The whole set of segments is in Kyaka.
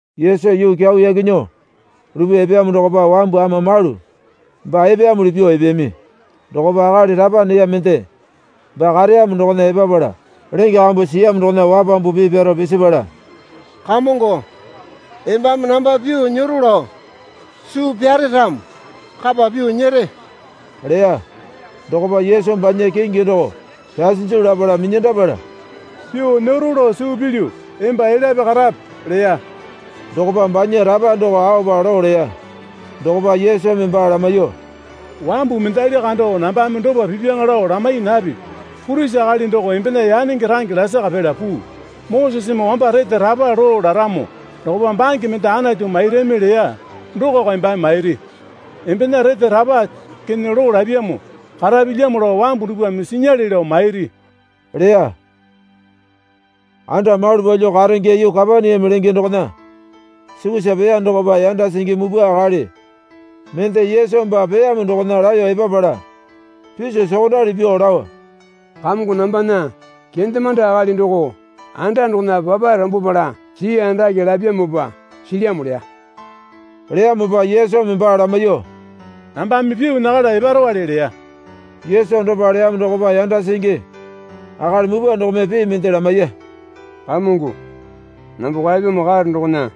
Yesu yuu kyau yaki nyuo lupyuo epeyamo dokopa wambu ama malu baa epeyamuli pyuo epeyami. Dokopa akali rapa neya mende baa kareyamo dokona epapala lenge kambu siyamo dokona wapambu pii pyaro pisipala Kamongo, Embame namba pyuo nyero lao suu pyare ramo kapa pyuo nyere, leya. Dokopa Yesu banya kingi doko pyasinju lapala minyandapala, pyuo nyero lao suu pilyu emba elyape karape, leya. Dokopa banya rapa doko aopa loo leya. Dokopa Yesumi baa lamaiyuo, Wambu mendali kando nambame dopa pipyaŋa lao lamai napipi. Purisi akali doko embena yanenge range lasaka pela puu. Moseseme wamba rete rapa loo laramo dokopa bange mende Anatu mairami leya dokoko embame mairi. Embena rete rapa kene loo lapyamo karapilyamo lao wambu dupwame sinyale lao mairi, leya. Anda malu palyuo karenge yuu Kapaneame lenge dokona sukusa peya dokopa yanda singi mupwa akali mende Yesu baa peyamo dokona laeyo epapala piso sokondali pyuo lao, Kamongo nambana kendemande akali doko anda dokona papae rambwapala sii andake lapyamopa silyamo, leya. Leyamopa Yesumi baa lamaiyuo, Nambame pyuo nyakala eparowale leya. Yesu dopa leyamo dokopa yanda singi akali mupwa dokome pii mende lamaiya. Kamongo, namba kwaepyamo karo dokona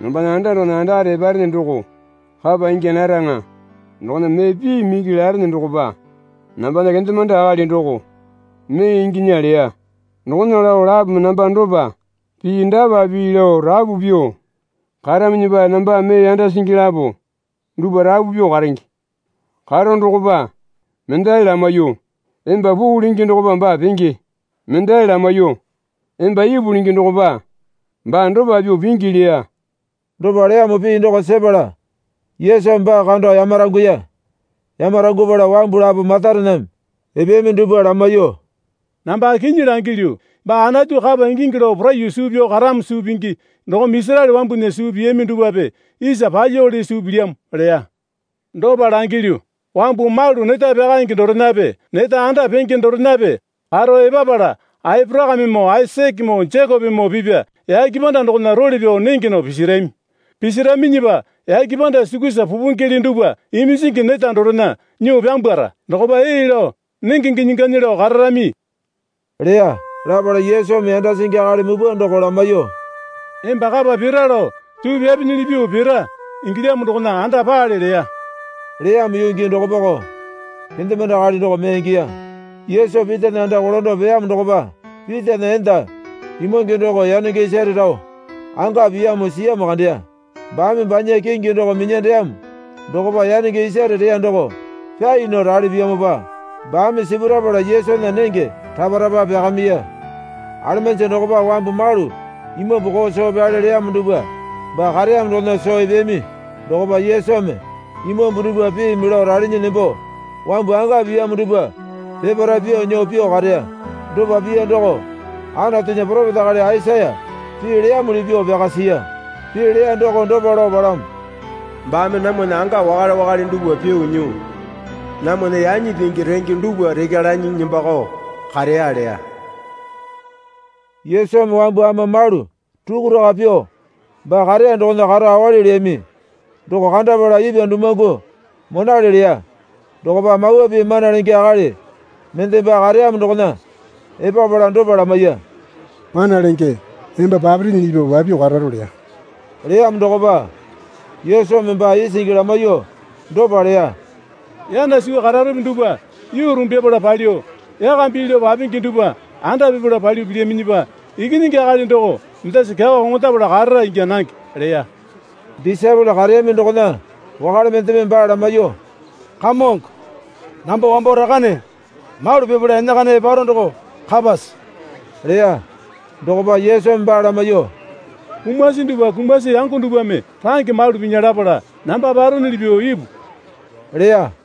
nambana anda dokona andakare eparene doko kapa ingya naraŋa. Dokona mee piimi iki larene dokopa nambana kendemande akali doko mee inginya leya. Dokona lao lapome namba dopa pii dapa pii lao rapu pyuo karaminyipa nambame mee yanda singi lapo dupwa rapu pyuo karenge. Karo dokopa, mendali lamaiyuo, Emba puu lenge dokopa baa penge, mendali lamaiyuo, Emba ipu lenge dokopa baa dopa pyuo pingi leya. Dopa leyamo pii doko sepala Yesumi baa kando yamaranguya. Yamarangupala wambu lapo matarename epeyami dupwa lamaiyuo, Namba kinyi langilyu, Baa Anatu kapa ingingi lao poraiyuo suu pyao karamo suu pingi dokome Isaraele wambunya suu piyami dupwape isa palyuowale suu pilyamo leya. Dopa langilyu, wambu malu neta pyakaenge dorenape neta anda penge dorenape karo epapala Aporakamemoo Aisakemoo Jekopemoo pipya yake panda dokona role pyao nenge nao pisarami. Pisaraminyipa yake panda sukusa pupingele dupwa iminjingi neta dorena nyuo pyambwara. Dokopa ee lao nenge ginyi ganyi lao kararami, leya. Lapala Yesumi yanda singi akali mupwa doko lamaiyuo, Emba kapa pira lao suu pyapinyili pyuo pira ingilyamo dokona anda paale leya. Leyamo yuu gii dokopako kendemande akali doko mee ingiya. Yesu Pitana anda kolando peyamo dokopa Pitana enda imwange doko yanenge isare rao anga piyamo siyamo kandeya. Baame banya kingi doko minyandeyamo dokopa yanenge isare reya doko pyai nao rali piyamopa baame sipurapala Yesunya nenge rapa rapa pyakamiya. Alemanji dokopa wambu malu imambu koo soo pyale leyamo dupwa baa kareyamo dokona soo epeyami. Dokopa Yesumi imambu dupwa piimi lao ralinyi nembo wambu anga piyamo dupwa peparae pyuo nyuo pyuo kareya. Dopa piya doko Anatunya poropeta akali Aisaya pii leyamuli pyuo pyaka siya. Pii leya doko dopa lao palamo, Baame namwana anga wakale wakale dupwa pyuo nyuo, namwana yanyi pingi renge dupwa rekya lanyi nembakao kareya leya. Yesumi wambu ama malu rukuraka pyuo baa kareya dokona karo awali leyami doko kandapala ipwa dumuwangu monale leya. Dokopa Mawa Pii mana lenge akali mende baa kareyamo dokona epapala dopa lamaiya. Mana lenge, emba papirinyili pyuo papyuo kararo, leya. Leyamo dokopa Yesumi baa isingi lamaiyuo dopa leya. Yana suwa kararope dupwa yuu rumbyapala palyuo, yaka bii lao papingi dupwa anda pipala palyuo pilyaminyipa Ikinyingi Akali doko mendasa kyawa koŋondapala karara ingya nange, leya. Disaepole kareyami dokona wakale mendeme baa lamaiyuo, Kamongo, Namba wambo rakane malu pipala enakana eparo doko kapase? leya. Dokopa Yesumi baa lamaiyuo, Kumasi dupwa kumasi yango dupwame range malu pinya lapala namba paronuli pyuo ipu, leya.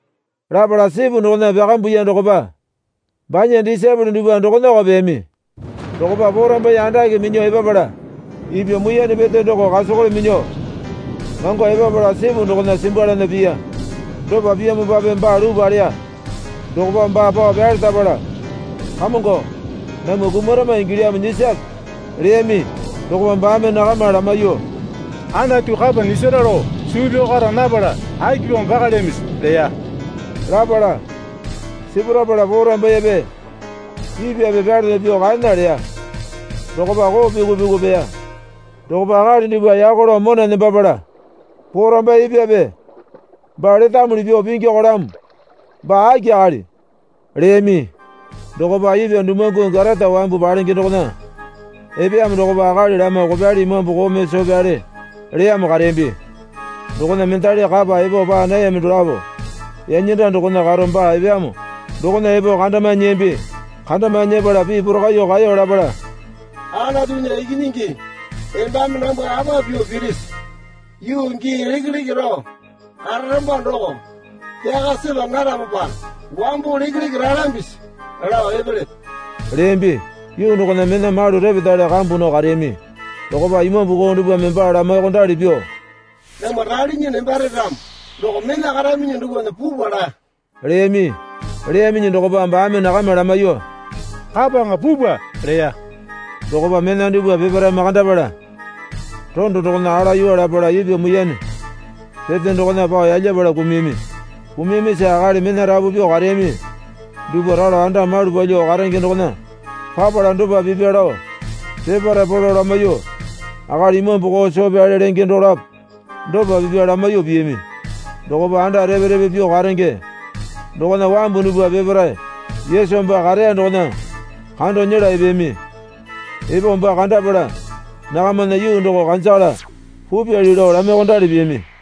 Lapala sipu dokona pyakambuya dokopa banya disaepole dupwa dokonako peyami. Dokopa porambaiye andake minyuo epapala ipwa muiyane pete doko kasakole minyuo mango epapala sipu dokona simbwalana piya. Dopa piyamopape baa luu paleya. Dokopa baa pao pyalerapala, Kamongo, namwa kumarama ingilyamo nyisape, leyami. Dokopa baame nakama lamaiyuo, Anatu kapa nyisara lao suu pyao kara napala akipamo pakalyamisi? leya. Lapala sipurapala porambaiyepe ipwape pyalana pyuo kaena leya. Dokopa koo pyuku pyuku peya. Dokopa akali dupwa yako lao mona nembapala, Porambaiye ipwape baa letamuli pyuo pingikolamo, baa aki akali? leyami. Dokopa ipwa dumuwangu Gatata wambu palenge dokona epeyamo dokopa akali lama kopyali imambu koome soo pyale leyamo kareyambi. Dokona mendali kapa epo paa nayami dolapo yanyanda dokona karo baa epeyamo dokona epo kandamae nyiyambi. Kandamae nyepala pii porakaiyuo kaeyo lapala, Anatunya Ikinyingi, embame nambwa apa pyuo pirisi? Yuu gii lekeleke rao kararamba doko pyaka sepa naramopa wambo lekeleke ralambisi lao epelepe? leyambi. Yuu dokona mena malu repetale kambu nao kareyami. Dokopa imambu koo dupwame baa lamaiyuokondali pyuo, Namwa ralinyi nembare ramo doko mena karaminyi dupwana pupwa laa, leyami. Leyaminyi dokopa baame nakama lamaiyuo, Kapaŋa pupwa, leya. Dokopa mena dupwa peparae makandapala rondo dokona alayuwa lapala ipwa muiyane pete dokona pao yalyapala kumuyami. Kumuyamisa akali mena rapu pyuo kareyami dupwa ralo anda malu palyuo karenge dokona papala dopa pipya lao peparae polo lamaiyuo, akali imambu koo soo pyale lenge dolapo dopa pipya lamaiyuo piyami. Dokopa anda repe repe pyuo karenge dokona wambu dupwa peparae Yesu baa kareya dokona kando nyela epeyami. Epo baa kandapala nakamana yuu doko kanjakala pupyali lao lamaiyuokandali piyami.